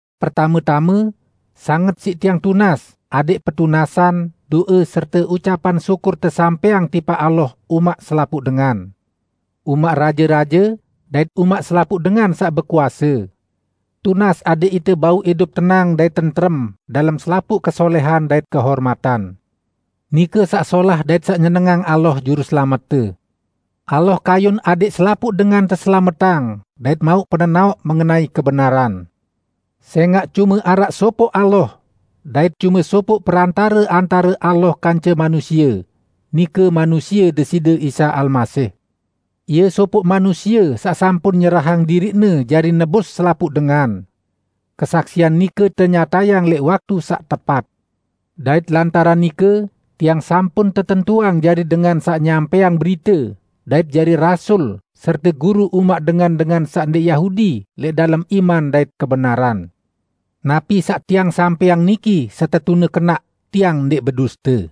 Pertame-tame, sanget siq tiang tunas adẽq petunasan, do'e serte ucapan syukur tesampẽang tipaq Allah umaq selapuq dengan; umaq raje-raje dait umaq selapuq dengan saq bekuase. Tunas adẽq ite bau idup tenang dait tentrem dalem selapuq kesolẽhan dait kehormatan. Nike saq solah dait saq nyenengang Allah, Juruselamette. Allah kayun adẽq selapuq dengan teselametang dait mauq penenaoq mengenai kebenaran. Sẽngaq, cume araq sopoq Allah, dait cume sopoq perantare antare Allah kance manusie, nike manusie Deside Isa Almasih. Ie sopoq manusie saq sampun nyerahang diriq-Ne jari nebus selapuq dengan: Kesaksian nike tenyatayang lẽq waktu saq tepat. Dait lantaran nike tiang sampun tetentuang jari dengan saq nyampẽang berite dait jari rasul serte guru umaq dengan-dengan saq ndẽq Yahudi lẽq dalem iman dait kebenaran. Napi saq tiang sampẽang niki setetune kenaq, tiang ndẽq beduste.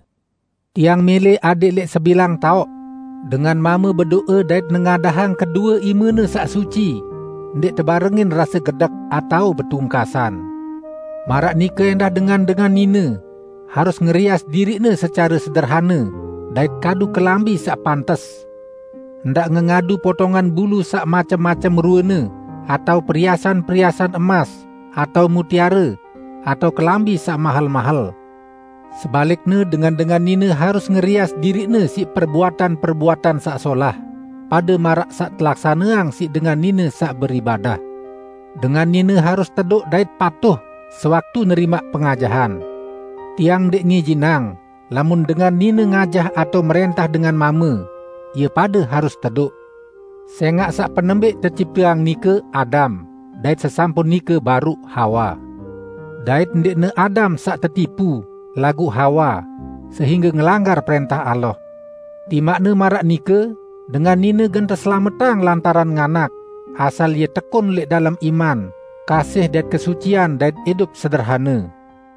Tiang mẽlẽ adẽq lẽq sebilang taoq, dengan mame bedo'e dait nengadahang kedue imene saq suci, ndẽq tebarengin rase gedek atao betungkasan. Maraq nike ẽndah dengan-dengan nine, harus ngerias diriqne secare sederhane dait kadu kelambi saq pantes. Ndaq ngengadu potongan bulu saq macem-macem ruene, atao periasan-periasan emas atao mutiare, atao kelambi saq mahel-mahel. Sebalikne, dengan-dengan nine harus ngerias diriqne siq perbuatan-perbuatan saq solah, pade maraq saq telaksaneang siq dengan nine saq beribadah. Dengan nine harus tedoq dait patuh sewaktu nerimaq pengajahan. Tiang ndẽq ngijinang lamun dengan nine ngajah atao mrẽntah dengan mame; ie pade harus tedoq. Sẽngaq saq penembẽq tecipteang nike Adam dait sesampun nike baruq Hawa. Dait ndẽqne Adam saq tetipu, laguq Hawa, sehingge ngelanggar prẽntah Allah. Timaqne maraq nike, dengan nine gen teselametang lantaran nganak, asal ie tekun lẽq dalem iman, kasih dait kesucian dait idup sederhane.